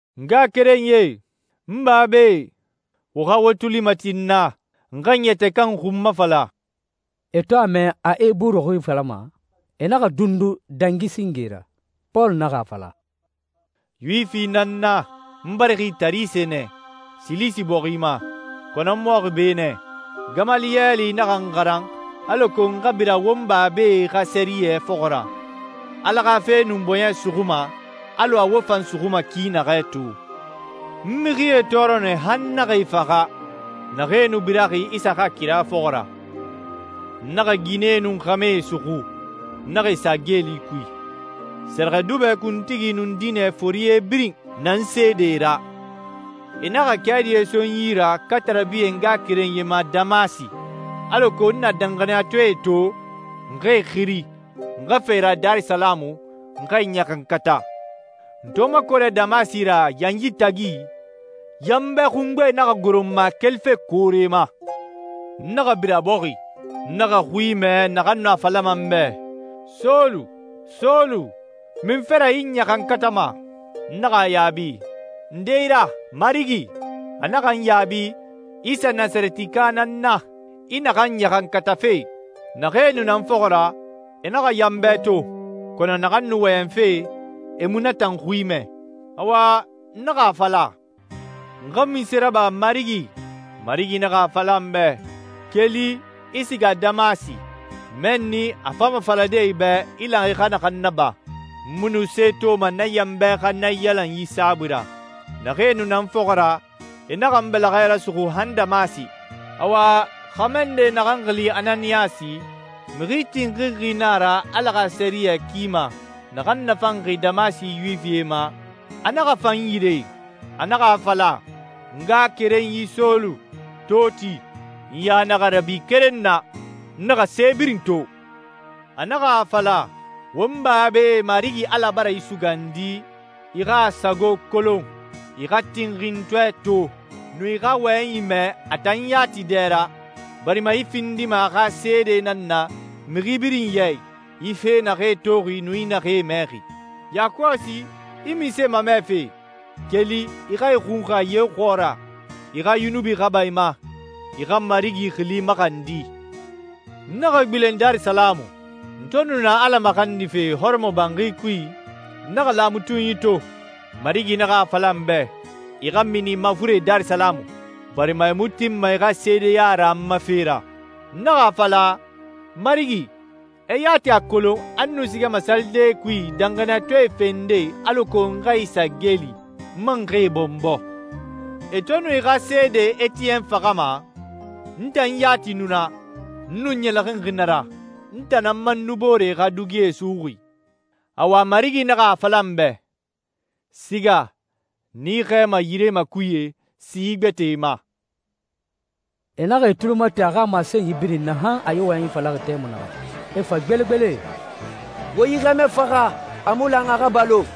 «N ngaxakerenyie, n babae, wo xa wo tuli mati n na, n xa n yɛtɛ kan xun mafala.» E to a mɛ a Eburu xui falama, e naxa dundu dangi singe ra. Pɔlu naxa a fala, «Yuwifi nan n na, n barixi Tarise nɛ, Silisi bɔxi ma, kɔnɔ n mɔxi be nɛ. Gamaliyɛli naxa n xaran alako n xa bira won babae xa sɛriyɛ fɔxɔ ra. Ala xa fe nu n bɔɲɛ suxuma alɔ a wo fan suxuma ki naxɛ to. N mixie tɔɔrɔ nɛ han n naxa e faxa, naxee nu biraxi Isa xa kira fɔxɔ ra. N naxa ginɛe nun xɛmɛe suxu, n naxa e sa geeli kui. Sɛrɛxɛdubɛ kuntigi nun diinɛ forie birin na n seedee ra. E naxa kɛɛdie so n yi ra katarabi e ngaxakerenyie ma Damasi alako n na danxaniyatɔɛe to, n xa e xiri, n xa fa e ra Darisalamu, n xa e ɲaxankata.» «N to makɔrɛ Damasi ra yanyi tagi, yanbɛ xungbe naxa goro n ma kelife koore ma. N naxa bira bɔxi. N naxa xui mɛ naxan nu a falama n bɛ, ‹Sɔlu, Sɔlu, munfe ra i n ɲaxankatama?› N naxa a yaabi, ‹Nde i ra, Marigi?› A naxa n yaabi, ‹Isa Nasarɛtika nan n na, i naxan ɲaxankatafe.› Naxee nu na n fɔxɔ ra, e naxa yanbɛ to, kɔnɔ naxan nu wɔyɛnfe, e mu na tan xui mɛ. Awa, n naxa a fala, ‹N xa munse raba, Marigi?› Marigi naxa a fala n bɛ, ‹Keli, i siga Damasi. Mɛnni a fama falade i bɛ i lan i xa naxan naba.› N mu nu se toma na yanbɛ xa naiyalanyi saabui ra. Naxee nu na n fɔxɔ ra, e naxa n bɛlɛxɛ rasuxu han Damasi.» «Awa, xɛmɛ nde naxan xili Ananiyasi, mixi tinxinxi na a ra Ala xa sɛriyɛ ki ma, naxan nafanxi Damasi Yuwifie ma, a naxa fa n yire. A naxa a fala, ‹N ngaxakerenyi Sɔlu, to ti.› N ya naxa rabi keren na, n naxa se birin to. A naxa a fala, ‹Won babae Marigi Ala bara i sugandi i xa a sago kolon, i xa Tinxintɔɛ to, nun i xa a wɔyɛnyi mɛ a tan yati dɛ ra, barima i findima a xa seede nan na mixi birin ya i, i fee naxee toxi nun i naxee mɛxi. Yakɔsi, i munse mamɛfe? Keli, i xa i xunxa ye xɔɔra, i xa yunubi xa ba i ma, i xa Marigi xili maxandi.›» «N naxa gbilen Darisalamu. N to nu na Ala maxandife hɔrɔmɔbanxi kui, n naxa laamatunyi to. Marigi naxa a fala n bɛ, ‹I xa mini mafuren Darisalamu, barima e mu tinma i xa seedeya ra n ma fe ra.› N naxa a fala, ‹Marigi, e yati a kolon a n nu sigama salidee kui danxaniyatɔɛe fende alako n xa e sa geeli, n man xa e bɔnbɔ. E to nu i xa seede Etiyɛn faxama, n tan yati nu na, n nu ɲɛlɛxinxi na ra. N tan nan man nu booree xa dugie suxuxi.› Awa, Marigi naxa a fala n bɛ, ‹Siga, n i xɛɛma yire makuye si gbɛtɛe ma.›» E naxa e tuli mati a xa masenyi birin na, han a yi wɔyɛnyi falaxi tɛmui naxɛ. E fa gbelegbele, «Wo yi xɛmɛ faxa. A mu lan a xa balo.»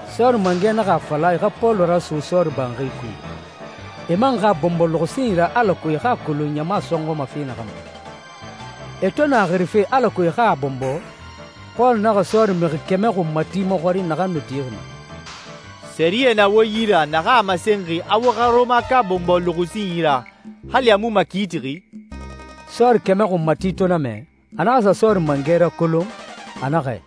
Sɔɔri mangɛ naxa a fala a e xa Pɔlu raso sɔɔri banxi kui, e man xa a bɔnbɔ luxusinyi ra alako e xa a kolon ɲama sɔnxɔma fe naxan ma. E to nu a xirife alako e xa a bɔnbɔ, Pɔlu naxa sɔɔri mixi kɛmɛ xunmati maxɔrin naxan nu tixi naa, «Sɛriyɛ na wo yi ra naxan a masenxi a wo xa Rɔmaka bɔnbɔ luxusinyi ra hali a mu makiitixi?» Sɔɔri kɛmɛ xunmati to na mɛ, a naxa sa sɔɔri mangɛ rakolon. A naxɛ,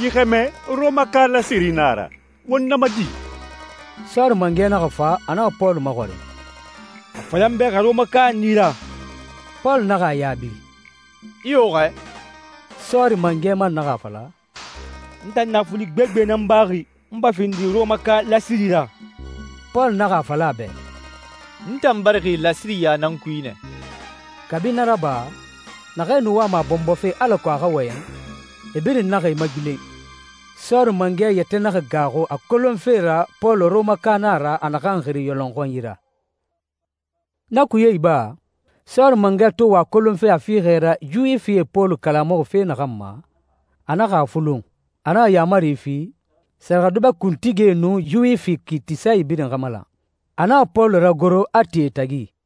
«Yi xɛmɛ Rɔmaka lasiri na a ra. Won na ma di?» Sɔɔri mangɛ naxa fa, a naxa Pɔlu maxɔrin, «A fala n bɛ xa Rɔmaka na i ra?» Pɔlu naxa a yaabi, «Iyo xɛ.» Sɔɔri mangɛ man naxa a fala, «N tan naafuli gbegbe nan baxi, n fa findi Rɔmaka lasiri ra.» Pɔlu naxa a fala a bɛ, «N tan barixi lasiriya nan kui nɛ.» Kabi na raba, naxee nu wama a bɔnbɔfe alako a xa wɔyɛn, e birin naxa e magbilen. Sɔɔri mangɛ yɛtɛ naxa gaaxu a kolonfe ra Pɔlu Rɔmaka na a ra, a naxan xiri yɔlɔnxɔnyi ra. Na kuye iba, sɔɔri mangɛ to wa a kolonfe a fiixɛ ra Yuwifie Pɔlu kalamuxi fe naxan ma, a naxa a fulun. A naxa yaamari fi, sɛrɛxɛdubɛ kuntigie nun Yuwifi kiitisae birin xa malan. A naxa Pɔlu ragoro, a ti e tagi.